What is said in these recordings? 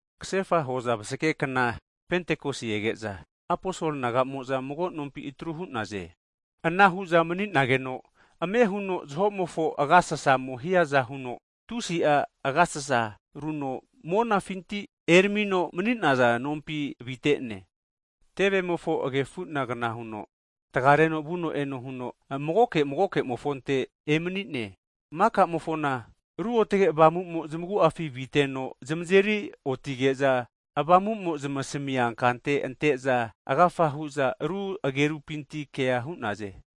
Kasefa hoza vasage kna Pentikos ege'za, aposol nagamoza mago nompi atru hu'naze. Ana hu'za mani'nageno amehuno zaho'mofo agasasamo hiaza huno, tusi'a agasasa runo monafinti eramino mani'naza nompi avite'ne. Tevemofo agefu'nagana huno, tagareno vuno eno huno, magoke magoke'mofonte emani'ne. Maka'mofona Ruotge Avamu'mo zamagu'afi viteno, zamazeri otige'za, Avamu'mo zamasamia kante ante'za, agafa hu'za aru agerupinti kea hu'naze.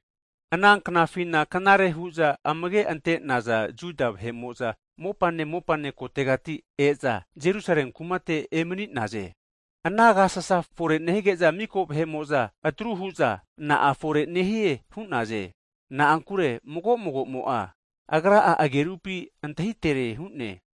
Ana knafina knare hu'za amage ante'naza Juda vahe'mo'za, mopane mopane kotegati e'za Jerusale kumate emani'naze. Ana agasasa fore nehige'za, miko vahe'mo'za atru hu'za na'a fore nehie hu'naze. Na'ankure mago mago'mo'a agra'a agerupi antahitere hu'ne.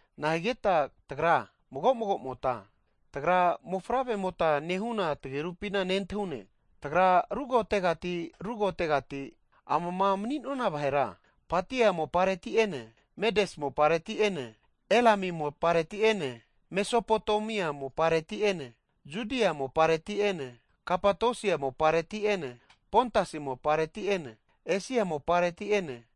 Na'a higeta tagra mago mago'mota tagra mofavremota nehuna tagerupina nentahune? Tagra rukotegati rukotegati (Amama mani'nona vahera) Patia mopareti'ene, Medes mopareti'ene Elami mopareti'ene, Mesopotemia mopareti'ene, Judia mopareti'ene, Kapatosia mopareti'ene, Pontasi mopareti'ene, Esia mopareti'ene,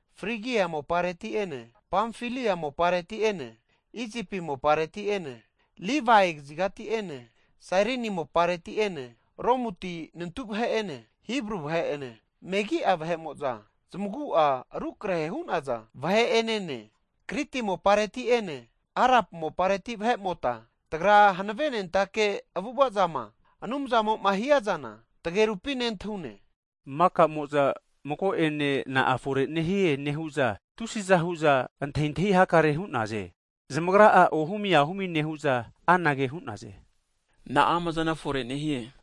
Frigia mopareti'ene, Pamfilia mopareti'ene, Isipi mopareti'ene, Livia kazigati'ene, Sairini mopareti ene, Romuti nantu vahe'ene, Hibru vahe'ene, megi'a vahe'mo'za zamagu'a rukrahe hu'naza vahe'enene. Kriti mopareti'ene Arab mopareti vahe'mota tagra hanavenentake avu'ava'zama Anumzamo'ma hia zana tagerupi nentahune! Maka'mo'za mago'ene na'a fore nehie nehu'za, tusi'za hu'za antahintahi hakare hu'naze. Zamagra'a ohumi ahumi nehu'za anage hu'naze, Na'a amazana fore nehie?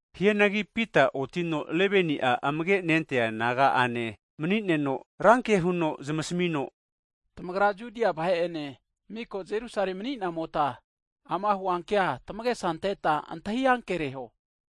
Hianagi Pita otino 11ni'a amage' nentaza naga'ane mani'neno, ranke huno zamasmino, tamagra Judia vahe'ene, miko Jerusale mani'namota ama huankea tamagesa anteta antahi ankereho.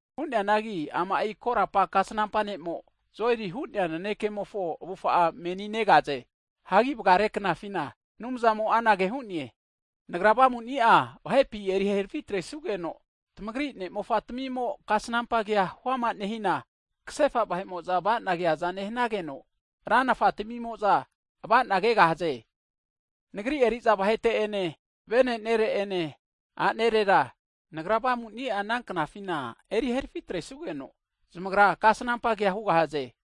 Hu'neanagi ama'i korapa kasnampa ne'mo, Joeli hu'nea nanekemofo avufa'a meni negaze. Hagi vagare knafina, Anumzamo'a anage hu'ne, Nagra Avamuni'a vahepi eri herafi atresugeno, tamagri ne'mofa tamimo, kasnampa kea huama nehina, kasefa vahe'mo'za ava'na keaza nehanageno, ranafa tamimo'za ava'na kegahaze. Nagri eri'za vahete'ene, vene'nere ene, a'nerera Nagra Avamu'ni'a ana knafina eri herafi atresugeno zamagra kasnampa kea hugahaze.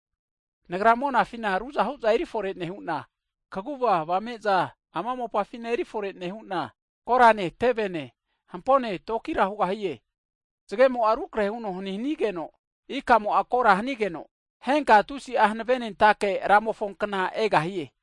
Nagra monafina ruzahu'za eri fore nehu'na, kaguva avame'za ama mopafina erifore nehu'na, korane, tevene, hampone tokira hugahie. Zgemo'a rukrahe huno hani hanigeno, ikamo'a kora hanigeno, henka tusi'a hanave'nentake Ramofo kna egahie.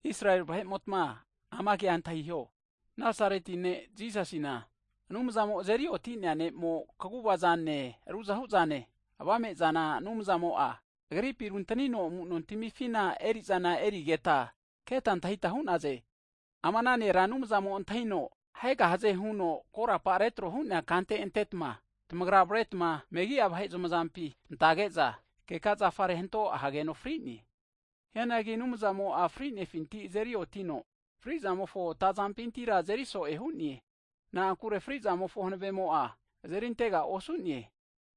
Israeli vahe'motma ama kea antahiho, Nazareti ne' Jisasina, Anumzamo azeri oti'nea ne'mo, kaguva zane ruzahu'zane, avame'zana Anumzamo'a, Agripi runtanino amuno tamifina eri'zana erigeta, keta antahita hu'naze. Ama ana nera, Anumzamo antahino ahegahaze huno korapa retro hu'nea kante antetma, tamagra avaretma megi'a vahe zamazampi antage'za, keka zafare hanto ahegeno fri'ne. Hianagi Anumzamo'a fri'nefinti azeri otino, fri'zamofo atazampinti azeri so'e hu'ne. Na'ankure frizamofo hanave'amo'a azerintega osu'ne.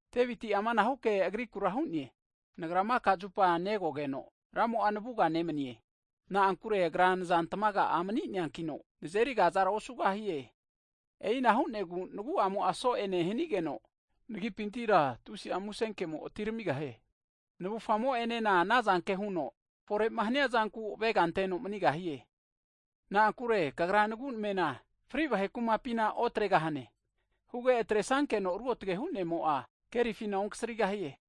Deviti'a amanahu ke agriku hu'ne, Nagra maka zupa negogeno, Ramo'a navuga nemanie, na'ankure Agra nza tmaga'a mani'neankino, nazeri kazara osugahie. E'ina hu'negu nagu'amo'a so'e nehanigeno, nagipintira tusi'a musenkemo atiramigahie. Navufamo'enena anazanke huno fore'ma haniazanku avega anteno manigahie. Na'ankure kagra nagu'namena fri vahe kumapina (Heidis), otregahane, huge atresankeno Ruotge hu'nemo'a kerifina okasrigahie.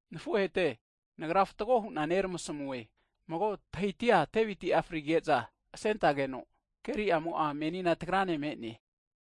Nafuhete, nagra fatgo hu'na neramasmu'e, mago tahiti'a Deviti'a frige'za asentageno, keri'amo'a menina tagrane me'ne.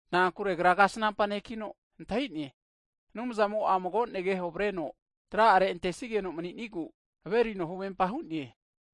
Na'ankure agra kasnampa nekino antahine, Anumzamo'a mago negeho avareno tra'are (kini trate) antesigeno mani'nigu averino huvempa hu'ne.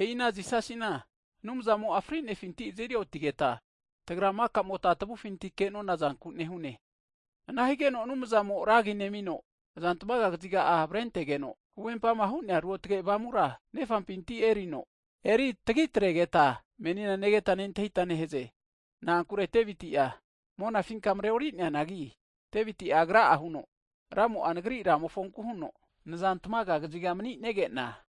E'i ana Jisasina, Anumzamo'a fri'nefinti azeri otigeta, tagra maka'mota tavufinti ke'nona zanku nehune. Ana higeno Anumzamo ragi nemino, azantamaga kaziga'a avarentegeno, huvempama hu'nea Ruotge Avamura Nefampinti erino, eritagitregeta menina negeta nentahita nehaze. Na'ankure Deviti'a monafinka mareori'neanagi, Deviti agra'a huno, Ramo'a, nagri Ramofonku huno, Naza tamaga kaziga mani'nege'na,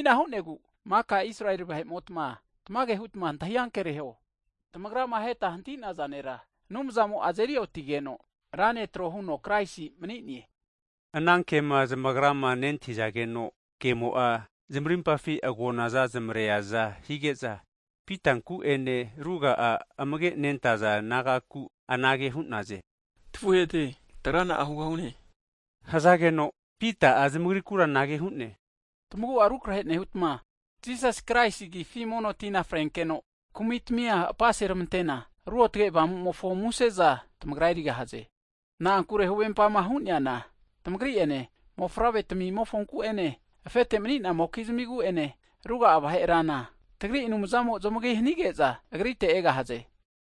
E'ina hu'negu, maka Israeli vahe'motma tamage hutma antahi ankereho, tamagrama aheta hanti'naza nera, Anumzamo azeri otigeno, Ra vahe tro huno Kraisi mani'ne. Ana kema zamagrama nentahizageno, kemo'a zamarimpafi agonaza zamareaza hige'za, Pitanku ene ruga'a aposol nagaku anage hu'naze, tafuhete tagra na'a hugahune? Hazageno, Pita'a zamagrikura anage hu'ne, tamagu'a rukrahe nehutma, Jisas Kraisi agifi mono tina frenkeno, kumi'timia apaseramante'na, ruotge Avamu'mofo museza tamagra erigahaze. Na'ankure huvempama hu'neana tamagri'ene, mofavre tamimofonku'ene, afete mani'namokizmigu'ene, ruga'a vahera tagri Ra Anumzamo zamagi hanige'za, Agrite egahaze.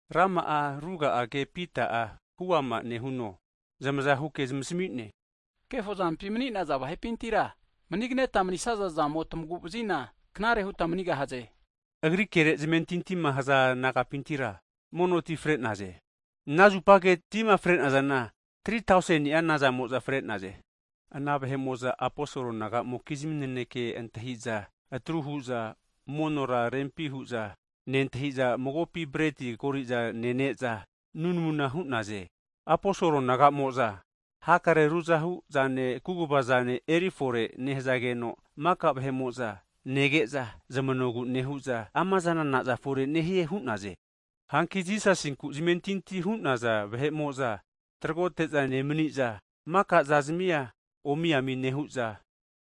Rama'a ruga'a ke Pita'a huama nehuno, zamazahuke zamasami'ne. Kefo zampima mani'naza vahe'pintira, manigneta manisaza zamo tamagu'vazina, knare huta manigahaze. Agri kere zamentintima haza nagapintira, monoti fre'naze, anazupage tima fre'nazana, 3tauseni'a nazamo'za fre'naze. Ana vahe'mo'za aposol nagamokizmi naneke antahiza atru hu'za monora rempi hu'za nentahiza, magopi breti kori'za nene'za (Lords sapa) nunamuna hu'naze. Aposol nagamo'za hakare ruzahu'zane, kuguva'zana erifore nehazageno, maka'a vahe'mo'za nege'za zamanogu nehu'za amazana na'za fore'nehie hu'naze. Hanki Jisasinku zamentinti hu'naza vahe'mo'za tragote'za nemani'za, maka'za zamia omi'ami nehu'za,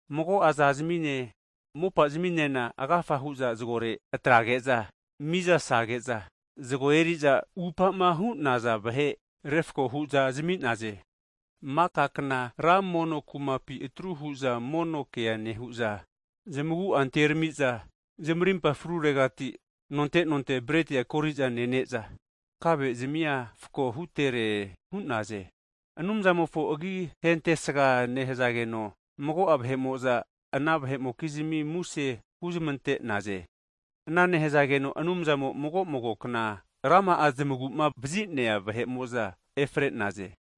mago'a zazamine, mopa zaminena agafa hu'za zagore atrage'za, miza'sage'za zago eri'za upama hu'naza vahe refako hu'za zami'naze. Maka kna ra mono (tempol) kumapi atru hu'za mono kea nehu'za, zamagu'a anterami'za, zamarimpa fruregati nonte nonte bretia koriza nene'za kave'zamia fako hutere hu'naze. Anumzamofo agi hentesga nehazageno, mago'a vahe'mo'za ana vahe'mokizmi muse huzmante'naze. Ana nehazageno Anumzamo zamagu'ma vazi'nea vahe'mo'za mago mago kna rama'a efare'naze.